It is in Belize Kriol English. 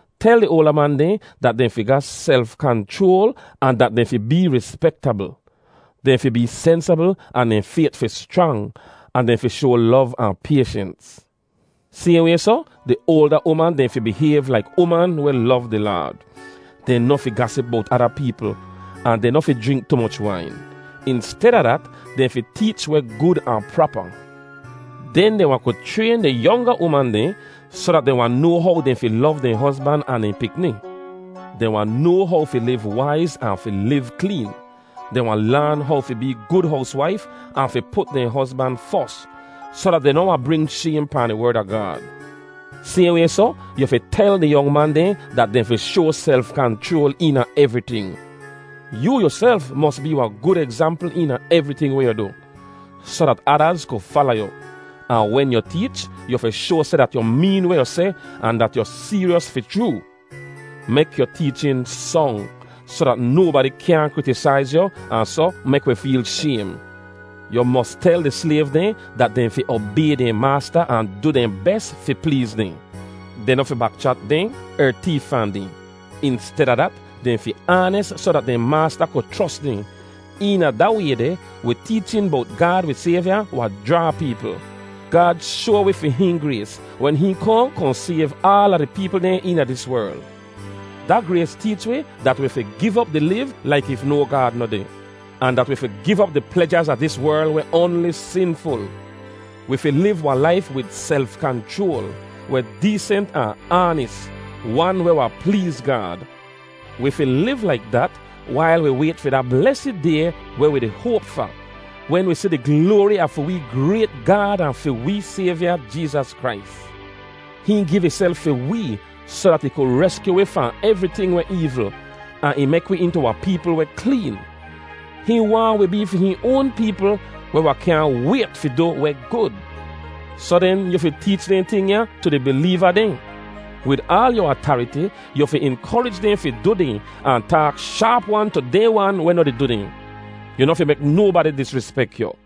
Tel di oalda man dehn dat dehn fi ga self-kanchroal ahn dat dehn fi bee rispektabl. Dehn fi bee sensabl ahn dehn fayt fi schrang, ahn dehn fi shoa lov ahn payshens. Sayhn way soh, di oalda uman dehn fi bihayv laik uman weh lov di Laad. Dehn noh fi gasip bowt ada peepl ahn dehn noh fi jrink tu moch wain. Insteda dat, dehn fi teech weh gud ahn prapa. Den dehn wahn ku chrayn di yonga uman dehn soh dat dehn wahn noa how dehn fi lov dehn hozban ahn dehn pikni. Dehn wahn noa how fi liv waiz ahn fi liv kleen. Dehn wahn laan how fi bee gud howswaif ahn fi put dehn hozban fos, soh dat dehn noh wahn bring shaym pahn di Werd a Gaad. Sayhn way soh, yu fi tel di yong man dehn dat dehn fi shoa self-kanchroal eena evriting. Yoo yuself mos bee wahn gud egzampl eena evriting weh yu du, soh dat adaz ku fala yu. Ahn wen yu teech, yu fi shoa seh dat yu meen weh yu seh ahn dat yu seeryos fi chroo. Mek yu teechin song, soh dat nobadi kyaahn kritisaiz yu ahn soh mek wi feel shaym. Yu mos tel di slayv dehn dat dehn fi obay dehn maasta ahn du dehn bes fi pleez dehn. Dehn noh fi bak-chat dehn er teef fahn dehn. Insteda dat, dehn fi aanis soh dat dehn maasta ku chros dehn. Eena da way deh, wi teechin bowt Gaad wi Sayvya wahn jraa peepl. Gaad shoa wi fi hihn grays wen hihn kohn kohn sayv aala di peepl dehn eena dis werl. Da grays teech wi dat wi fi giv op di liv laik if no Gaad noh deh, ahn dat wi fi giv op di plejaz a dis werl weh oanli sinful. Wi fi liv wahn laif wid self-kanchroal, weh deesent ahn aanis, wan weh wahn pleez Gaad. Wi fi liv laik dat wail wi wayt fi da blesid Day weh wi di hoap fa, wen wi si di gloari a fi wee grayt Gaad ahn fi wee Sayvya, Jeezas Krais. Hihn giv ihself fi wee soh dat ih ku reskyu wi fahn evriting weh eevl, ahn ih mek wi intu wahn peepl weh kleen. Hihn waahn wi bee fi hihn oan peepl weh wahn kyaahn wayt fi du weh gud. Soh den, yu fi teech dehn ting ya tu di bileeva dehn. Wid aal yu atariti, yu fi inkorij dehn fi du dehn ahn taak shaap-wan tu dehn wan weh noh di du dehn. Yu noh fi mek nobadi disrispek yu.